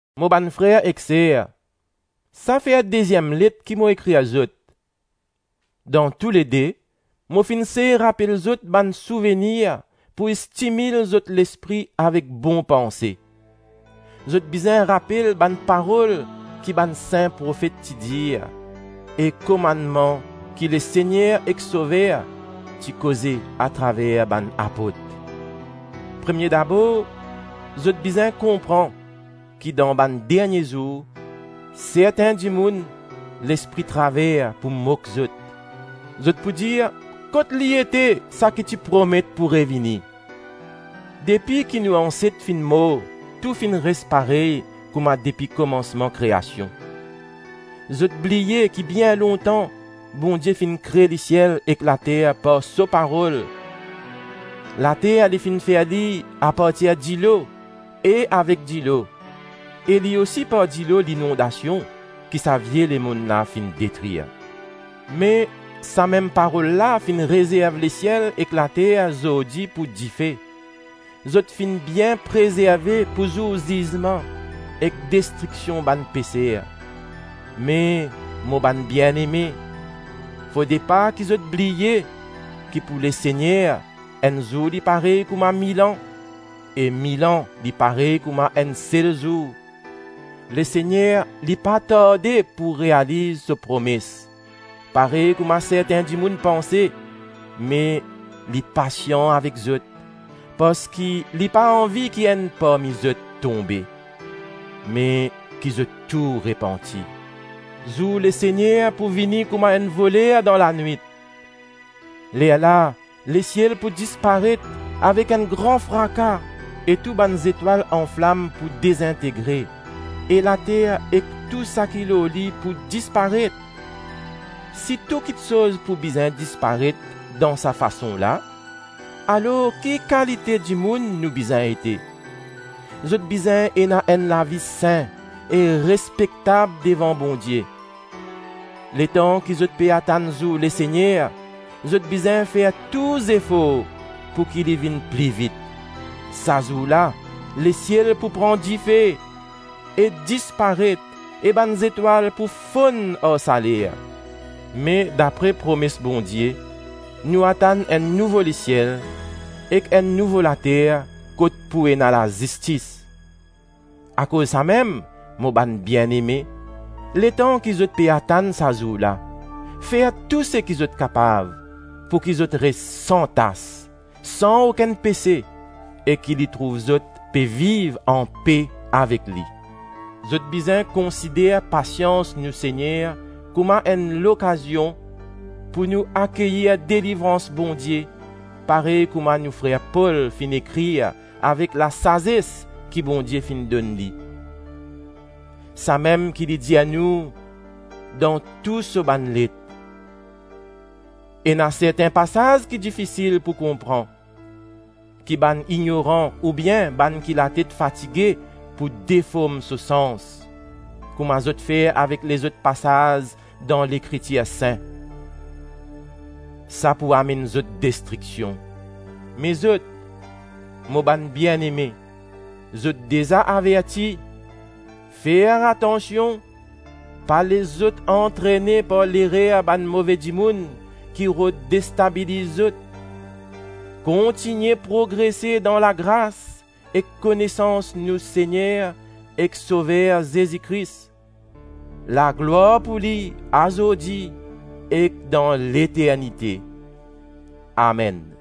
Mo bann frer ek ser, sa fer deziem let ki mo ekrir zot. Dan toulede, mo finn sey rapel zot bann souvenir pou stimil zot lespri avek bon panse. Zot bizin rapel bann parol ki bann sin profet ti dir, e komannman ki Lesegner ek Sover ti koze atraver bann apot. Premie dabor, zot bizin konpran ki dan bann dernie zour, sertin dimoun lespri traver pou mok zot, zot pou dir, “Kot li ete saki ti promet pou revini? Depi ki nou anset finn mor tou finn res parey kouma depi komansman kreasion!” Zot bliye ki bien lontan Bondie finn kre lesiel ek later par so parol. Later li finn fer li apartir dilo e avek dilo; e li osi par dilo linondasion, ki sa vie lemonn la finn detrir. Me, sa mem parol la finn rezerv lesiel ek later zordi pou dife. Zot finn bien prezerve pou zour zizman ek destriksion bann peser. Me, mo bann bieneme, fode pa ki zot bliye ki pou Lesegner, enn zour li parey kouma mil an, e mil an li parey kouma enn sel zour. Lesegner, li pa tarde pou realiz so promes, parey kouma sertin dimoun panse, me li pasian avek zot, parski li pa anvi ki enn parmi zot tonbe, me ki zot tou repanti. Zour Lesegner pou vini kouma enn voler dan lanwit; lerla lesiel pou disparet avek enn gran fraka e tou bann zetwal anflam pou dezintegre, e later ek tou saki lor li pou disparet. Si tou kiksoz pou bizin disparet dan sa fason la, alor ki kalite dimoun nou bizin ete? Zot bizin ena enn lavi sin e respektab devan Bondie. Letan ki zot pe atann zour Lesegner, zot bizin fer tou zefor pouki li vinn pli vit. Sa zour la, lesiel pou pran dife e disparet e bann zetwal pou fonn ar saler. Me, dapre promes Bondie, nou atann enn nouvo lesiel ek enn nouvo later kot pou ena lazistis. Akoz samem, mo bann bieneme, letan ki zot pe atann sa zour la, fer tou seki zot kapav pouki zot res san tas, san okenn pese e ki li trouv zot pe viv anpe avek li. Zot bizin konsider pasians nou Segner kouma enn lokazion pou nou akeyir delivrans Bondie, parey kouma nou frer Pol finn ekrir avek lasazes ki Bondie finn donn li. Samem ki li dir nou dan tou so bann let. Ena sertin pasaz ki difisil pou konpran, ki bann ignoran oubien bann ki latet fatige pou deform so sans, kouma zot fer avek lezot pasaz dan Lekritir sin. Sa pou amenn zot destriksion. Me zot, mo bann bieneme, zot deza averti. Fer atansion, pa les zot antrene par lerer bann move dimoun ki rod destabiliz zot. Kontigne progrese dan lagras ek konesans nou Segner ek Sover Zezi Kris. Laglwar pou li azordi ek dan leternite. Amenn.